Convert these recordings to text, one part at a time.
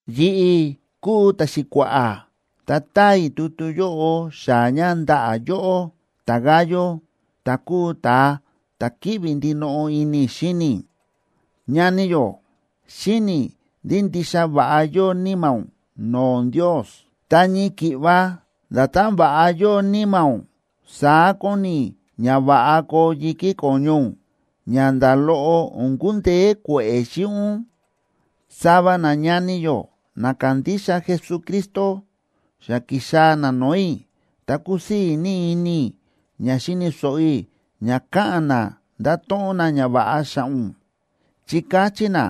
Yi̱ꞌi̱ kúu ta̱xi̱kua̱ꞌa̱, ta táa i̱ tutu yóꞌo xaa̱ ña ndaꞌa̱ yóꞌó ta̱Gayo, ta̱ kúu ta̱a ta̱ kíꞌvi ndinoꞌo ini i̱ xíni i̱. Ñani yó, xíni̱ i̱ ndí ndixa va̱ꞌa yóo níma̱ ún no̱o̱ Ndios. Ta ñii ki̱ꞌva nda̱tán va̱ꞌa yóo níma̱ ún, saá kóni i̱ ña va̱ꞌa koo yi̱kí ko̱ñu ún, ña nda̱ loꞌo o̱n kundeé kue̱ꞌe̱ xíꞌin ún. Sava nañani yó na kándixa Jesucristo xa ki̱xaa̱ na no̱o̱ i̱, ta kúsii̱ ní ini i̱ ña xi̱ni̱ so̱ꞌo i̱ ña káꞌa̱n na ndáto̱ꞌon na ñava̱ꞌa xa̱ꞌa̱ ún, chi káchí na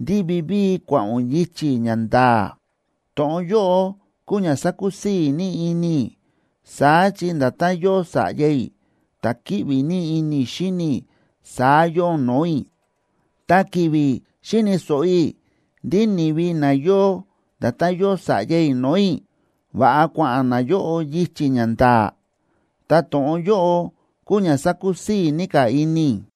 ndí vivíi kua̱ꞌa̱n ún yichi̱ ña nda̱a̱. To̱ꞌon yóꞌo kúu ña sákusii̱ ní ini i̱, saá chi nda̱tán yóo sa̱ꞌya i̱ ta̱ kíꞌvi ní ini i̱ xíni i̱, saá yóo ún no̱o̱ i̱. Ta ki̱vi̱ xíni̱ so̱ꞌo i̱ ndí ni̱vi na yóo nda̱tán yóo sa̱ꞌya i̱ no̱o̱ i̱, va̱ꞌa kua̱ꞌa̱n nayóꞌo yichi̱ ña nda̱a̱, ta to̱ꞌon yóꞌo kúu ña sakusii̱ ní ka̱ ini i̱.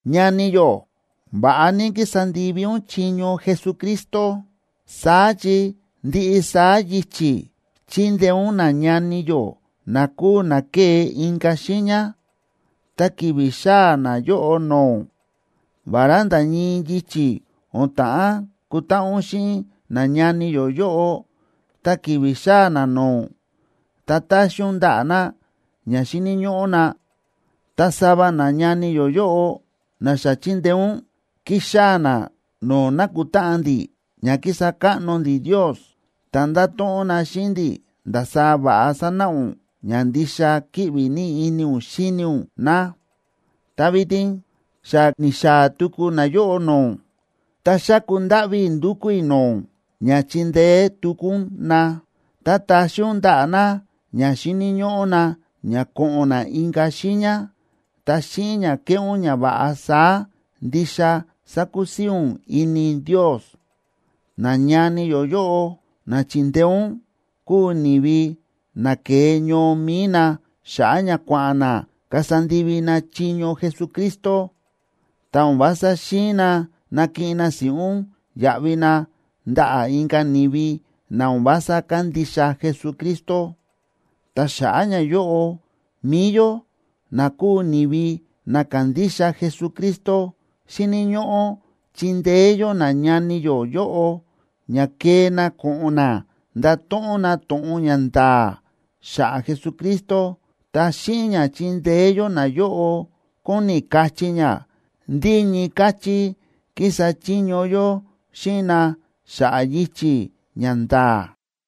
Ñani yó, va̱ꞌa ní kísa ndivi ún chiño Jesucristo. Saá chi ndiꞌi saá yichi̱ chíndeé ún nañani yó na kúu na ke̱e inka̱ xiiña, ta ki̱vi̱ xáa̱ nayóꞌo no̱o̱ ún. Vará nda̱ ñii yichi̱, o̱n ta̱ꞌán kutáꞌan ún xíꞌin nañani yó yóꞌo, ta ki̱vi̱ xáa̱ na no̱o̱ ún, ta táxi ún ndaꞌa̱ na ña xíni̱ ñóꞌó na. Ta sava nañani yó yóꞌo na xa chi̱ndeé ún, ki̱xaa̱ na no̱o̱ nákutáꞌan ndi̱ ña kísa káꞌno ndi̱ Ndios, ta nda̱to̱ꞌon na xíꞌin ndi̱ ndasaá va̱ꞌa sa̱náꞌa ún ña ndixa kíꞌvi ní ini ún xíni ún na. Ta vitin xa ni̱xaa̱ tuku nayóꞌo no̱o̱ ún, ta xáku ndáꞌví i̱ ndúkú i̱ no̱o̱ ún ña chindeé tuku ún na, ta taxi ún ndaꞌa̱ na ña xíni̱ ñóꞌó na ña ko̱ꞌo̱n na inka̱ xiiña. Ta xíꞌin ña keꞌé ún ñava̱ꞌa saá, ndixa sakusii̱ ún ini Ndios. Nañani yó yóꞌo, na chíndeé ún, kúu ni̱vi na ke̱e ñoo mi̱i na xa̱ꞌa̱ ña kua̱ꞌa̱n na kasa ndivi na chiño Jesucristo, ta o̱n vása xi̱in na nakiꞌin na si̱ꞌún yaꞌvi na ndaꞌa̱ inka̱ ni̱vi na o̱n vása kándixa Jesucristo. Ta xa̱ꞌa̱ ñayóꞌo, mi̱i yó, na kúu ni̱vi na kándixa Jesucristo, xíni̱ ñóꞌó chindeé yó nañani yó yóꞌo ña kee na ko̱ꞌo̱n na ndato̱ꞌon na to̱ꞌon ña nda̱a̱ xa̱ꞌa̱ Jesucristo. Ta xíꞌin ña chíndeé yó nayóꞌo kóni kachí ña ndí ñii káchí kísa chiño yó xíꞌin na xa̱ꞌa̱ yichi̱ ña nda̱a̱.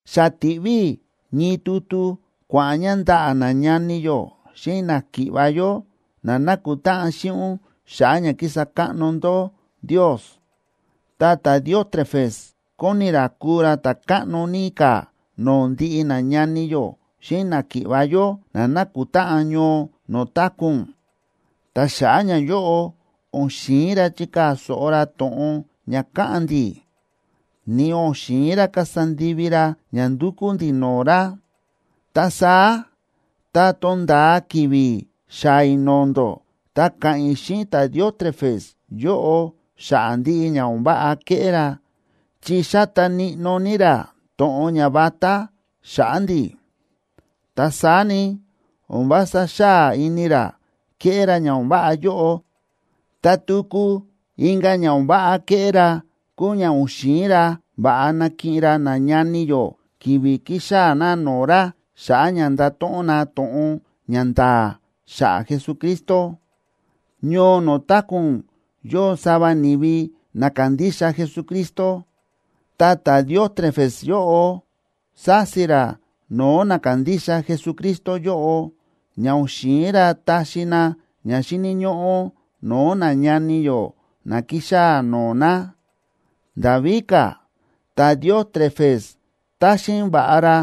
Xa ti̱ꞌví i̱ ñii tutu kua̱ꞌa̱n ña ndaꞌa̱ nañani yó xíꞌin náki̱ꞌva̱ yó na nákutáꞌan xíꞌin ún xa̱ꞌa̱ ña kísa káꞌno ndó Ndios. Ta ta̱Diótrefes kóni ra kuu ra ta̱ káꞌno ní ka̱ no̱o̱ ndiꞌi nañani yó xíꞌin náki̱ꞌva̱ yó na nákutáꞌan ñoo no̱o̱ táku̱ ún, ta xa̱ꞌa̱ ñayóꞌo, o̱n xi̱in ra chikaa̱ so̱ꞌo ra to̱ꞌon ña káꞌa̱n ndi̱, ni o̱n xi̱in ra kasa ndivi ra ña ndúkú ndi̱ no̱o̱ ra. Ta saá tá tonda̱a ki̱vi̱ xaa̱ i̱ no̱o̱ ndó, ta ka̱ꞌa̱n i̱ xíꞌin ta̱Diótrefes yóꞌo xa̱ꞌa̱ ndiꞌi ña o̱n váꞌa kéꞌé ra, chi xáta níꞌnó ní ra to̱ꞌon ña vatá xa̱ꞌa̱ ndi̱. Ta saá ni, o̱n vása xáa ini ra kéꞌé ra ña o̱n váꞌa yóꞌo, ta tuku inka̱ ña o̱n váꞌa kéꞌé ra kúu ña o̱n xi̱in ra va̱ꞌa nakiꞌin ra nañani yó ki̱vi̱ kíxaa̱ na no̱o̱ ra xa̱ꞌa̱ ña ndato̱ꞌon na to̱ꞌon ña nda̱a̱ xa̱ꞌa̱ Jesucristo. Ñoo no̱o̱ táku̱ ún yóo sava ni̱vi na kándixa Jesucristo, ta ta̱Diótrefes yóꞌo sási ra no̱o̱ na kándixa Jesucristo yóꞌo, ña o̱n xi̱in ra taxi na ña xíni̱ ñóꞌó no̱o̱ nañani yó na kíxaa̱ no̱o̱ na. Nda̱ víka̱, ta̱Diótrefes táxin va̱ꞌa ra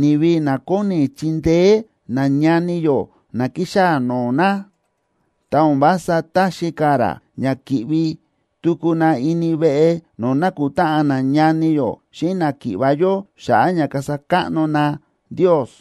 ni̱vi na kóni chindeé nañani yó na ki̱xaa̱ no̱o̱ na, ta o̱n vása táxi ka̱ ra ña ki̱ꞌvi tuku na ini veꞌe no̱o̱ nakutáꞌan nañani yó xíꞌin náki̱ꞌva̱ yó xa̱ꞌa̱ ña kasa káꞌno na Ndios.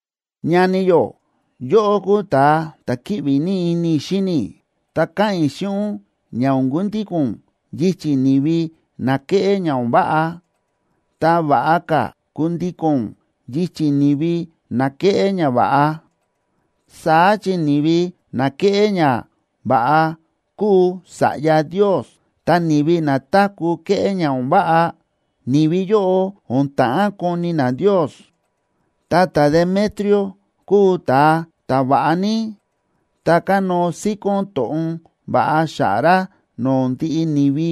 Ñani yó, yóꞌó kúu ta̱a ta̱ kíꞌvi ní ini i̱ xíni i̱, ta káꞌa̱n i̱ xíꞌin ún ña o̱n kundíko̱n ún yichi̱ ni̱vi na kéꞌé ña o̱n váꞌa, ta va̱ꞌa ka̱ kundíko̱n ún yichi̱ ni̱vi na kéꞌé ñava̱ꞌa. Saá chi ni̱vi na kéꞌé ñava̱ꞌa kúu sa̱ꞌya Ndios, ta ni̱vi na táku̱ kéꞌé ña o̱n váꞌa, ni̱vi yóꞌo o̱n ta̱ꞌán koni na Ndios. Ta ta̱Demetrio kúu ta̱a ta̱va̱ꞌa ní, ta kánóo síkón to̱ꞌon va̱ꞌa xa̱ꞌa̱ ra no̱o̱ ndiꞌi ni̱vi,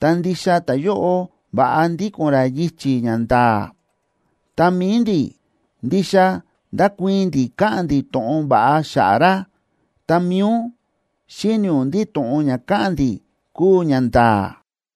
ta ndixa ta̱yóꞌo va̱ꞌa ndíko̱n ra yichi̱ ña nda̱a̱. Ta mi̱i ndi̱, ndixa ndákuii̱n ndi̱ káꞌa̱n ndi̱ to̱ꞌon va̱ꞌa xa̱ꞌa̱ ra, ta mi̱i ún, xíni̱ ún ndí to̱ꞌon ña káꞌa̱n ndi̱ kúu ñanda̱a̱.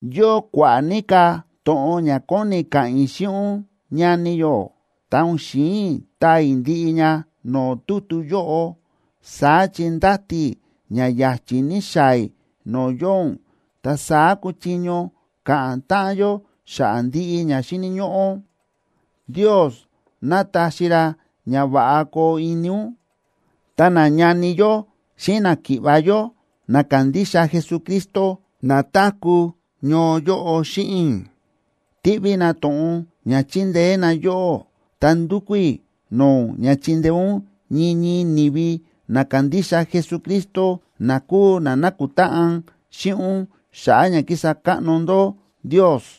Yóo kua̱ꞌa̱ ní ka̱ to̱ꞌon ña kóni i̱ ka̱ꞌa̱n i̱ xíꞌin ún, ñani yó, ta o̱n xi̱in i̱ taa i̱ ndiꞌi ña no̱o̱ tutu yóꞌo. Saá chi ndáti i̱ ña ya̱chi̱ ní xaa̱ i̱ no̱o̱ yóo ún, ta saá kuchiño ka̱ꞌa̱n táꞌan yó xa̱ꞌa̱ ndiꞌi ña xíni̱ ñóꞌó. Ndios ná táxi ra ña va̱ꞌa koo ini ún. Ta nañani yó xíꞌin náki̱ꞌva̱ yó na kándixa Jesucristo na táku̱ ñoo yóꞌo xíꞌin i̱, tíꞌví na to̱ꞌon ña chindeé na yóꞌó. Ta ndúkú i̱ no̱o̱ ún ña chindeé ún ñii ñii ni̱vi na kándixa Jesucristo, na kúu na nákutáꞌan xíꞌin ún xa̱ꞌa̱ ña kísa káꞌno ndó Ndios.